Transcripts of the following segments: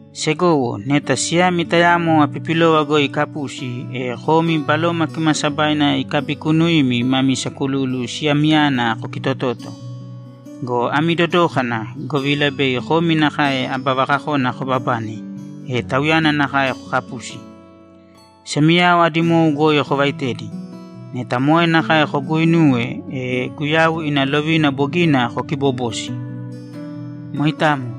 Segowo, neta siyami tayamo apipilova goi ikapusi, e komi Baloma Kimaasabaina ikabikuunuimi mami sakululu siyamiyana kokitotōto. Go ami dodōkana, govila bei komi nakae aba vakakona kobabane, e tauyana nakae kokapusi. Semiyao adi mou goi kovaitēdi. Neta moe nakae koguuinuwe, e Guyau ina lovina bogina kokiibobosi. Moitamo.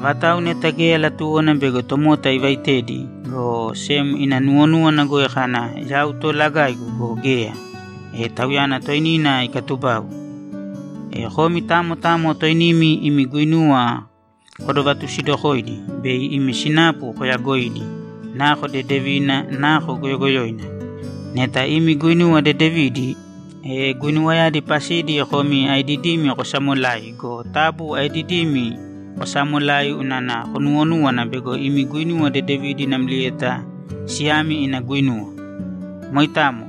Avatau neta geya latuwona bego tomota ivaitedi, go sem ina nuwonúwana goi kana, ‘Yau toolagaigu’ go, geya, e tauyana toinina ikaatubau. E komi tamo tamo toinimi imi guinuwa kodovatusidokōidi bei imi sinapu koyagoidi, nako dedevina, nako goyogoyoina. Neta imi guinuwa dedevidi, e guinuwayadi pasidi komi aedidimi kosamolai go, taabu aedidimi kosaamolāi unana konuwonúwana bego imi guinuwa dedevidi namlieta siyami ina guinuwa. Moitamo.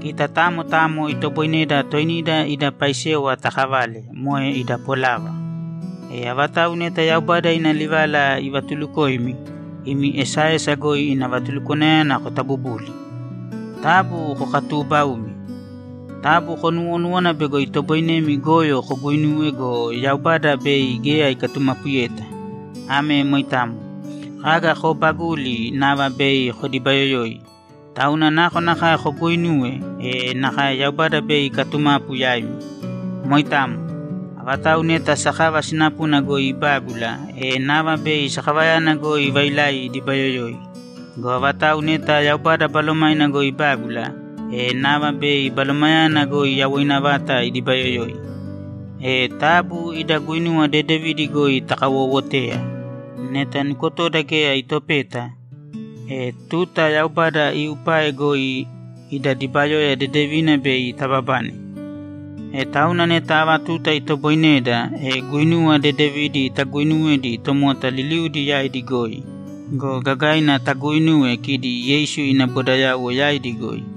Kita tamo tamo itoboineda toinida ida paisewa takavale, moe ida polava. E avatau neta Yaubada ina livala ivatulukoimi, imi esaesa goi ina vatulúkwana kotabubūli. Taabu kokatuubaūmi. Taabu konuuwonūwana bego itoboinemi goyo koguuinuwe go, Yaubada bei geya ikatumapuyeta. Ame moitamo. Kaga koobaguli, nava bei kodibayoyoi. Tauna nakonakae koguuinuwe, e nakae Yaubada bei ikatumapu yaimi. Moitamo. Avatau neta sakava sinapuna goi ibágula, e nava bei sakavayana goi vailai idibayoyoi. Go avatau neta Yaubada Balomaina goi ibágula, e nava bei Balomayana goi yawoina vata idibayoyoi. E taabu ida guinuwa dedevidi goi takawoowotēya. Neta nukotoda geya itopeta, e tuta Yaubada iupae goi ida dibayoya dedevina bei tababane. E tauna neta ava tuta itoboineda, e guinuwa dedevidi taguinuwēdi tomota liliudi yaidi goi go, gagaina taguinūwe kidi Yeisu ina bodayauwo yaidi goi.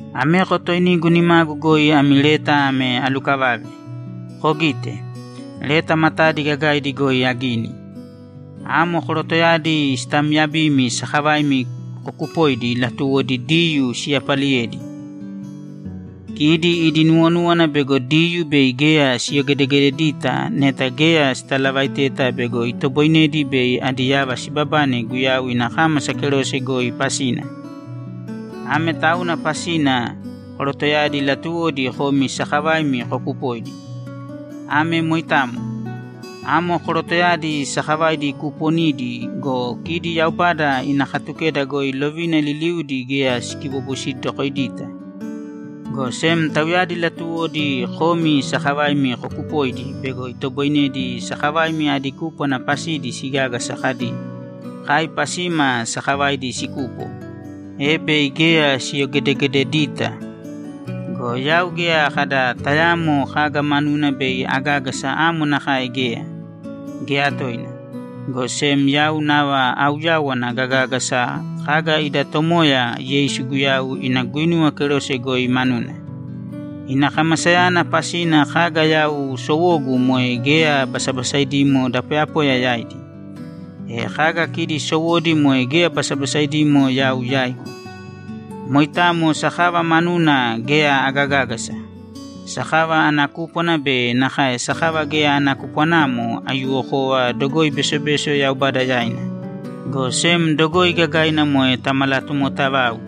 Ameko toinigu nimagu goi ami leta ame alukavave. Kogīte. Leta matadi gagaidi goi agini. Amo korotoyadi sitaamyabimi sakavaimi kokupoidi latuwodi Diyuu siyapaliyedi. Kidi idi nuwonúwana bego Diyuu bei geya siyogedegededita neta geya sitalavaiteta bego itoboinedi bei adi yava sibabane Guyau ina kámasa kerose goi pasina. Ame tauna pasina korotoyadi latuwodi komi sakavaimi kokupoidi. Ame moitamo. Amo korotoyadi sakavaidi kuuponidi go, kidi Yaubada ina Katukeda goi lovina liliudi geya sikibobosidokoidita, go sem tauyadi latuwodi komi sakavaimi kokupoidi bego itoboinedi sakavaimi adi kúpwana pasidi sigágasa kadi, ‘Kai pasima sakavaidi sikupo’, e bei geya siyogedegededita. Go yau geya kada tayaamo kaga manuna bei agágasa amo nakae geya, geya toina! Go sem yau nava auyawana gagágasa kaga ida Tomoya Yeisu Guyau ina guinuwa kerose goi manuna. Ina kamasayana pasina kaga yau sowogu moe geya basabasaidimo da poyapoya yaidi. E kaga kidi sowodi moe geya basabasaidimo yau yaigu. Moitamo sakava manuna geya agagágasa. Sakava ana kúpwana be nakae sakava geya ana kupwanamo, aiyuwokova dogoi besobeso Yaubada yaina, go sem dogoi gagaina moe tamalatomotavau.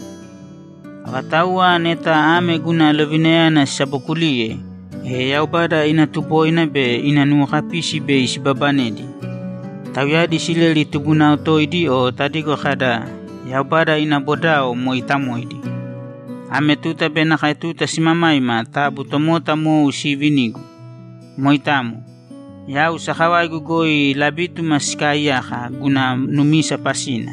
Avatauwa neta ame guna lovinayana sisabokuliye, e Yaubada ina tuboina be ina nuwokapisi bei sibabanedi. Tauyadi Isileli tubunao toidi o tadigo kada, ‘Yaubada ina bodao mooitamoidi.’ Ame tuta be nakae tuta simamaima taabu tomota mou siivinīgu. Moitamo. Yau sakavaigu goi labítuma sikaaiyaka guna numisa pasina.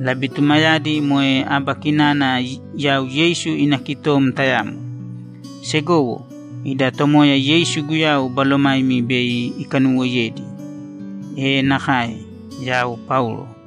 Labitumayadi moe aba kinana yau Yeisu ina kitom tayamo. Segowo, ida Tomoya Yeisu Guyau balomaimi bei ikanuwoiyedi. E nakae! Yau Paulo